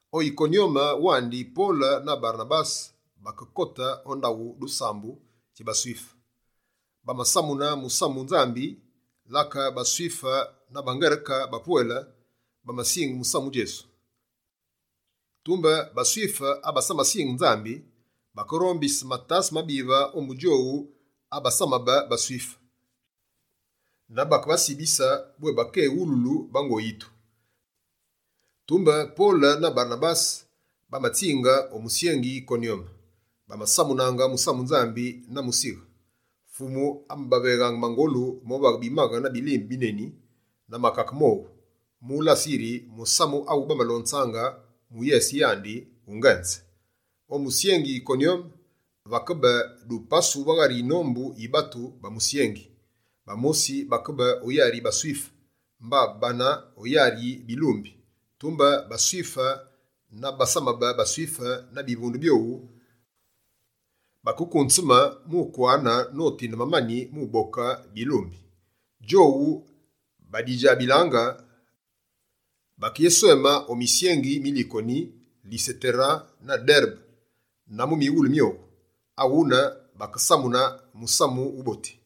O Yikonyome wandi Pole na Barenabase bakekote o ndaghu dusambu dji baSwife. Bamasamune musamu Nzambi, lake baSwife na baNgereke bapwele bamasinge musamu Djesu. Tumbe baSwife abasamasinge Nzambi, bakerombise matase mabive ombu djowu abasamabe baSwife, na bakebasibise bwé bakéwululu bango yitu. Tumbe dikalewube nane, Pole na Barenabase bamatsinge o musyengi Yikonyome. Bamasamunaange musamu Nzambi na musighe. Fumu amabaveghaange mangolu movaghe bimaghe na bilimbe bineni na makake mowu, mu ulase yiri, musamu awu bamalonzaange mu yese yandi, wungenze. O musyengi Yikonyome, vakebe dupasu va ghari yinombu yi batu ba musyengi. Bamosi bakebe o yari yi baSwife, mba bane o yari yi bilumbi. Tumbe baSwife na bo basamabe baSwife na bivunde byowu bakekunzeme mukwane notinde mamani mu uboke bilumbi. Djowu badidjabilaange, bakeyesweme o misyengi mi Likoni, Lisetere na Derebe, na mu mighule myowu. Aghune, bakesamune Musamu Wuboti.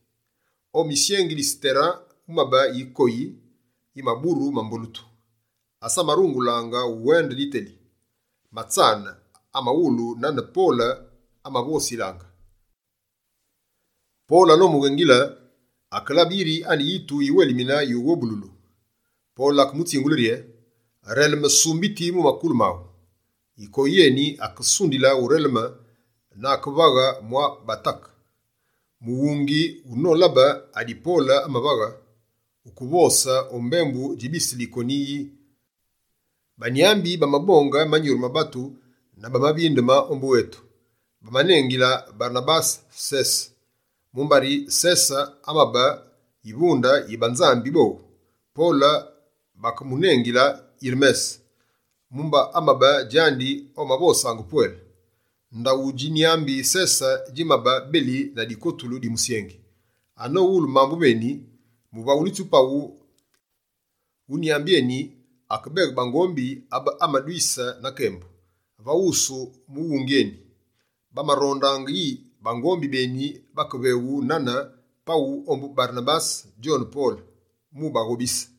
O musyengi Lisetere wumabe yikoyi, yimaburu mambolutu, asamarungulaange uwende diteli. Matsane, amawulu nane Pole amavosilaange. Pole anomughengile, akelabe yiri ane yitu yiwelimine yughobululu. Pole akemutsingule rye: «Releme, sumbiti mu makulu maghu!» Yikoyi yeni akesundile ureleme na akevaghe mwa batake. Mughungi wunolabe adi Pole amavaghe, wukevose o mbembu dji bise Likoni yi: «Banyambi bamabonge manyuru ma batu na bamavindeme ombu etu!». Bamanengile Barenabase «Sese», mumbari Sese amabe yivunde yi banzambi bowu. Pole bakemunengile «Yirmese», mumba amabe djandi omavosaange pwele. Ndaghu dji nyambi Sese djimabe beli na dikotulu di musyengi. Anowulu mambu meni, muvaghulitsi paghu wu nyambi eni akebeghe bangombi abebamadwise na kembu, va wusu mughungi eni. Bamarondaange yi bangombi beni bakeveghu nane paghu ombu Barenabase djone Pole mu baghobise.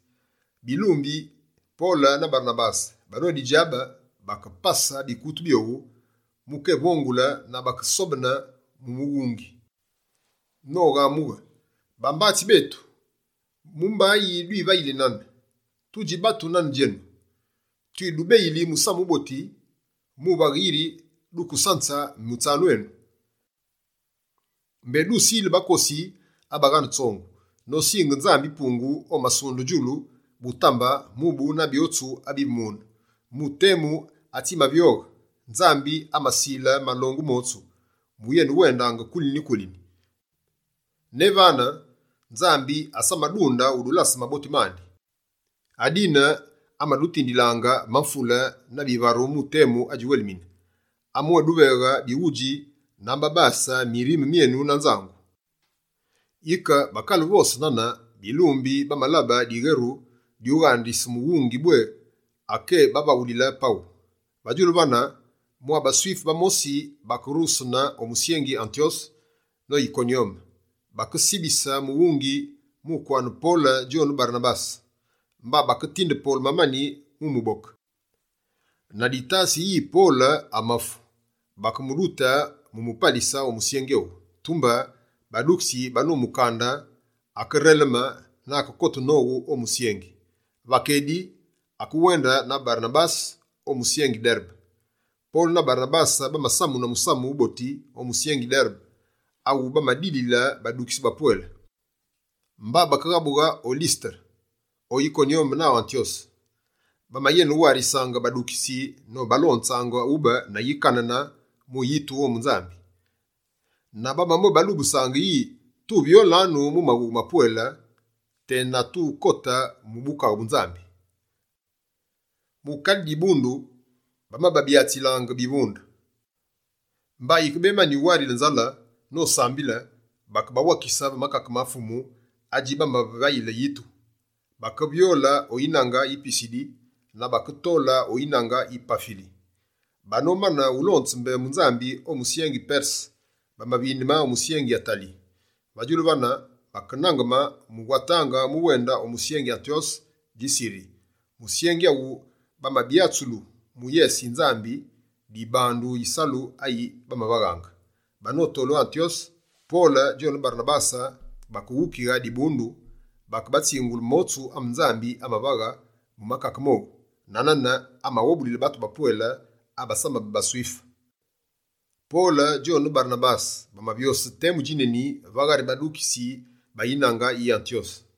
Bilumbi Pole na Barenabase, banodidjabe, bakepase bikutu byowu mu kevongule na bakesobene mu mughungi, noghamughe: «Bambatsi betu, mubayi dwivayili nane? Tudji batu nane djenu. Twidubeyili Musamu Wuboti, muvaghe yiri dukesanze mutsanu enu. Mbé dusile bakosi abaghane tsongu, nosinge Nzambi-Pungu omasunde djulu, butambe, mubu na byotsu abivu mune. Mu temu atsimavyoghe, Nzambi amasile malongu motsu wuyenewendaange kulini-kulini. Ne vane, Nzambi asamadunde udulase maboti mandi. Adine, amadutindilaange mamvule na bivaru mu temu adjiwelimine. Amabwéduveghe bighudji na amabase mirime myenu na nzangu.» Yike bakale uvose nane, bilumbi bamalabe diweru dyughandise mughungi, bwé akébavaghulile paghu. Va djulu vane, mwa baSwife bamosi bakerughesene o musyengi Antyose no Yikonyome, bakesibise mughungi mu kwane Pole djone Barenabase. Mba baketinde Pole mamani mu muboke. Na ditase yi Pole amafu, bakemudute mu mupalise o musyengi owu. Tumbe badukitsi banomukande, akereleme na akekote nowu o musyengi. Va kedi, akewende na Barenabase o musyengi Derebe. Pole na Barenabase bamasamune Musamu Wuboti o musyengi Derebe, awu bamadilile badukitsi bapwele. Mba bakeghabughe o Lisetere, o Yikonyome na Antyose. Bamayenewarisaange badukitsi, nobalonzaange ube na yikanene mu yitu ombu Nzambi. Na bamabwébalubusaange yi: «Tuvyolanu mu maghughe mapwele ne tukekote mu Bukaghe bu Nzambi.» Mu kale dibundu bamababyatsile bivunde, mba yikebemani uwarile nzale nosambile, bakebawakise va makake ma Fumu adji bamavayile yitu. Bakevyole o yinange yi Pisidi, na baketole o yinange yi Pafili. Banomane ulonze mbembu Nzambi o musyengi Perse, bamavindeme o musyengi Atali. Va djulu vane, bakenangeme mu watange mu wende o musyengi Antyose dji Siri, musyengi awu bamabyatsulu mu yese yi Nzambi dibandu yisalu ayi bamavaghe. Banotole o Antyose, Pole djone Barenabase bakeghukighe dibundu. Bakebatsingule motsu ame Nzambi amavaghe mu kake mowu, na nane amaghobulile batu bapwele abasamabe baSwife. Pole djone Barenabase bamavyose temu djineni va ghari badukitsi ba yinange yi Antyose.